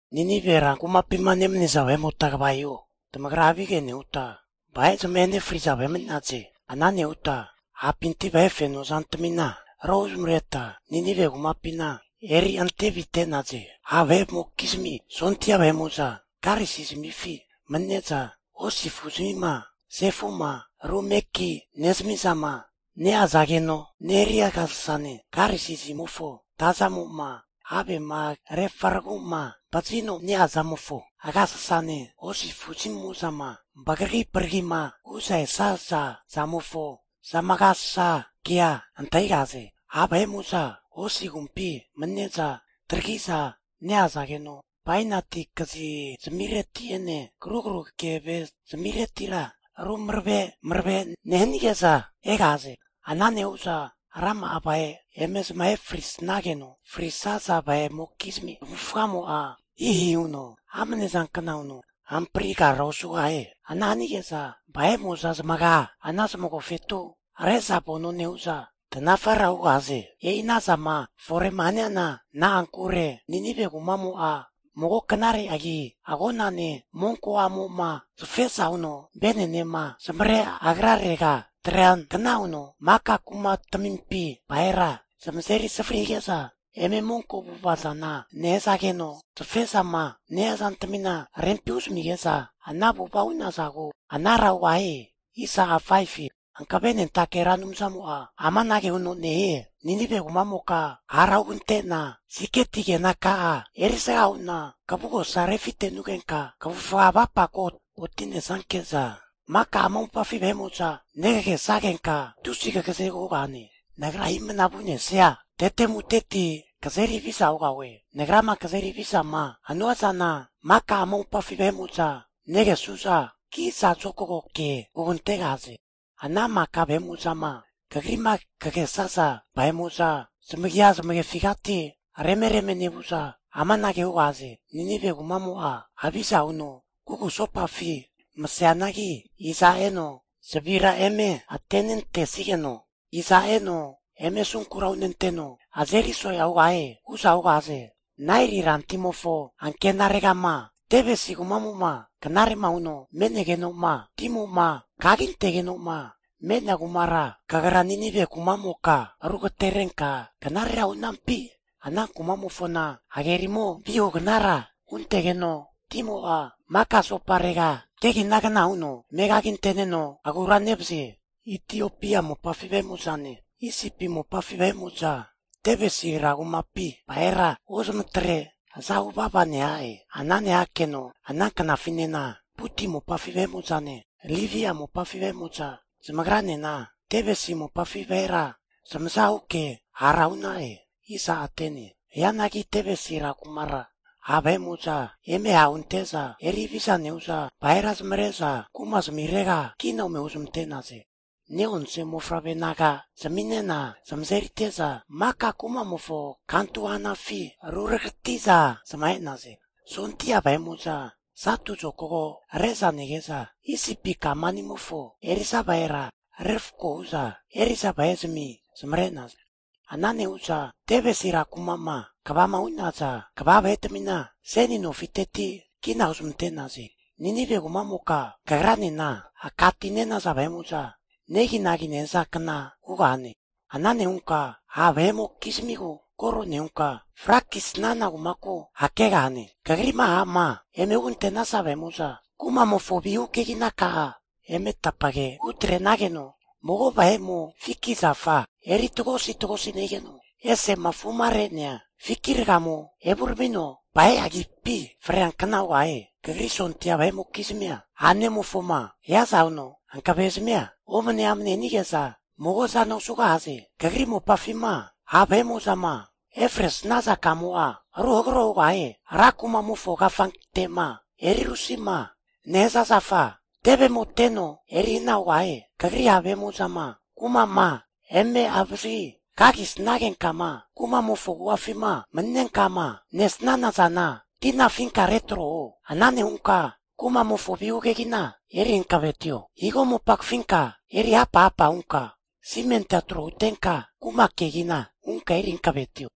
Ninive rankumapima nemaniza vahe'mota kva hiho. Tamagra havige nehuta vahe zamahe nefriza vahe mani'naze. Ana nehuta hapinti vahe feno zantamina rohu zamareta Ninive kumapina eri ante avite'naze. Ha' vahe'mokizmi sondia vahe'mo'za karisi zamifi mani'neza hosi afu zamima sefu'ma rumeki nezami'zama neazageno neria agasasane, karisi zamimofo tazamo'ma havema refaragu'ma vazino ne-ea zamofa agasasane, hosi afuzamimo'zama vagari vagarima hu'za esaza zamofo zamagasasankea antahigahaze. Ha' vahe'mo'za hosi agumpi manine'za taragi'za ne-eazageno, bainati kazi zamireti'ene karugaru keve zamiretira ru marave marave nehanige'za egahaze. Ana nehu'za rama'a vahe eme zamahe frisnageno, frisaza vahe'mokizmi zamavufagamo'a hihi huno amne zankna huno hamprigara osugahie. Ana hanige'za vahe'mo'za zamaga ana zamagofetu re'za vano nehu'za tanafara hugahaze. E'i ana zama fore'ma haniana na'ankure, Ninive kumamo'a mago knare agi agonane monko a'mo'ma safeza huno vene'nema zamavare agrarega atreankna huno, maka kumatamimpi vahera zamazeri savari hige'za eme monko avu'ava zana nehazageno, safe'zama nehia zantamina rempi huzamige'za ana avu'ava hu'nazagu anara hugahie. Hankavenentake Ra Anumzamo'a amanage huno nehie, Ninive kumamoka hara hugante'na siketi kenaka'a erisga hu'na kavugosa refitenunka kavufga kavapako oti'nesanke'za maka ama mopafi vahe'mo'za negagesagenka tusi kagazegu hugahane. Nagra himna vu'nesania tetemuteti kazeri haviza hugahue. Nagrama kazeri havizama hanua zana maka ama mopafi vahe'mo'za negesu'za kiza zokago ke hugantegahaze. Ana maka vahe'mo'zama kagri'ma kagesaza vahe'mo'za, zamagia zamefigati reme reme nevu'za amanage hugahaze. Ninive kumamo'a haviza huno kugusopafi maseanagi, iza eno zavira eme atenentesigeno, iza eno eme asunkura hunenteno azeri so'ea huntegahie? hu'za hugahaze. Naeli ran timofo ankenaregama Tebesi kumamo'ma knare'ma huno me'negeno'ma, timo'ma kagintegeno'ma me'nea kumara kagra Ninive kumamoka rugaterenka knarera hu'nampi? Ana kumamofona hagerimo vihugnara huntegeno timo'a maka asoparega keginagna huno mekaginte'neno agura nevazie. Itiopia mopafi vahe'mo'zane, Isipi mopafi vahe'mo'za Tebesi rankumapi vahera ozmatre zamazahu vava nehaze. Ana nehakeno ana knafinena Puti mopafi vahe'mo'zane Libia mopafi vahe'mo'za zamagranena Tebesi mopafi vahera zamaza huke hara hu'na'e. Hianagi Tebesi rankumara ha' vahe'mo'za eme ha' hunte'za eri haviza nehu'za vahera zamavare'za kuma zamirega kina ome huzmante'naze. Ne'onse mofavre naga zaminena zamazerite'za maka kumamofo kantu hanafi ruragati'za zamahe'naze. Sondia vahe'mo'za satu zokago re'za nege'za, Isipi kamanimofo eri'za vahera refko hu'za eri'za vahe'zami zamare'naze. Ana nehu'za Tebesi rankuma'ma kvama hu'naza kva vahetamina seni nofiteti kina huzmante'naze. Ninive kumamoka, kagranena aka ti ne'naza vahe'mo'za neginagi nehazankna hugahane. Ana nehunka ha' vahe'mokizmigu koro nehunka frakisana kumaku hakegahane. Kagri'ma ha'ma eme hugantenaza vahe'mo'za, kumamofo vihu keginaka'a eme tapage hutrenageno, mago vahe'mo fiki zafa eri tagosi tagosi nehigeno, ese'ma afure'nea fiki ragamo evuramino vahe agipi freankna hugahie. Kagri sondia vahe'mokizmia, a'nemofoma hiaza huno hankave zamia omane amane hanige'za mago zana osugahaze. Kagri mopafima ha' vahe'mo'zama efresaza kamo'a ruhagro hugahie. Ran kumamofo kafante'ma eri rusima nehaza zafa tevemo teno eri hana hugahie. Kagri ha' vahe'mo'zama kuma'ma eme avazagi kagi sagenka'ma kumamofo agu'afima mani'nenka'ma nesana zana tina afinka retro huo. Ana nehunka kumamofo vihu kegina eri hankavetio. Higo mopa kafinka eri hapa hapa hunka simentia tro hutenka, kuma kegina hunka eri hankavetio.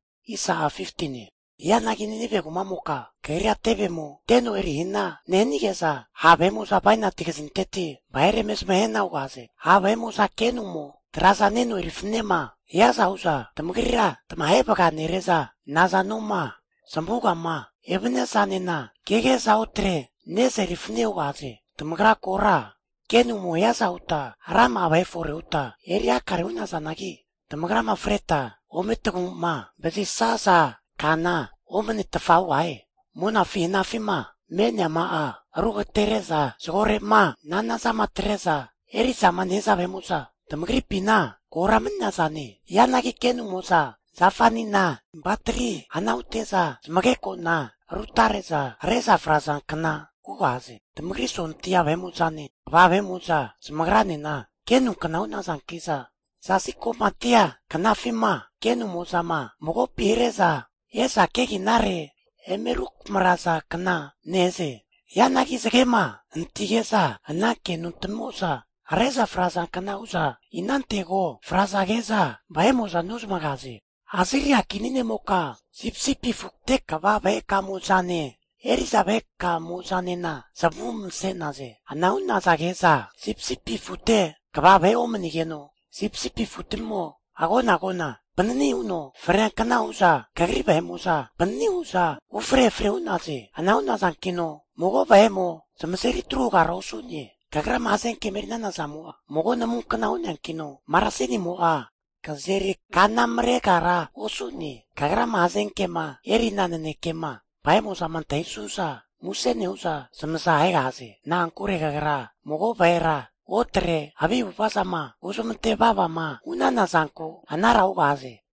Hianagi Ninive kumamoka kagria tevemo teno eri hana nehanige'za, ha' vahe'mo'za bainati kazinteti vahera eme zamahe hana hugahaze. Ha' vahe'mo'za kenu'mo traza neno eri fananema hiaza hu'za tamagrira tamahe vaga nere'za, nazamo'ma zamavugama evania zanena kege'za otre ne'za eri fanane hugahaze. Tamagra kora kenu'mo hiaza huta rama'a vahe fore huta eri hakare hu'nazanagi, tamagrama freta ome tamagu'ma vazisaza kana omanetfa hugahie! Monafi hanafi'ma me'neama'a rugatere'za zagorema nanazama atre'za eri'zama nehaza vahe'mo'za tamagripina kora mani'nazane. Hianagi kenumo'za zafani'na vatari hana hute'za, zamageko'na rutare'za hare'za frazankna hugahaze. Tamagri sondia vahe'mo'zane, kva vahe'mo'za zamagranena kenukna hu'nazanki'za, zasi ko'matia knafima kenumo'zama magopi hare'za e'za keginare eme rukamarazankna nehaze. Hianagi zagema hanatige'za ana kenu tamimo'za hare'za frazankna hu'za, inantego frazage'za vahe'mo'za nozamagaze. Asiria kini ne'moka, sipisipi afute kva vahekamo'zane, eri'za vahekamo'zanena zamavu mase'naze. Ana hu'nazage'za sipisipi afute kva vahe omani'negeno sipisipi afutamimo agona agona panani huno freankna hu'za, kagri vahe'mo'za panani hu'za ufre efre hu'naze. Ana hu'nazankino mago vahe'mo zamazeri tru hugara osu'ne. Kagrama hazenkema eri'nana zamo'a, mago namunkna hu'neankino marasinimo'a kazeri kanamaregara osu'ne. Kagrama hazenkema erina nanekema vahe'mo'zama antahisu'za, muse nehu'za zamaza ahegahaze. Na'ankure kagra mago vahera otre havi avu'ava zama huzamante vavama hu'nana zanku anara hugahaze.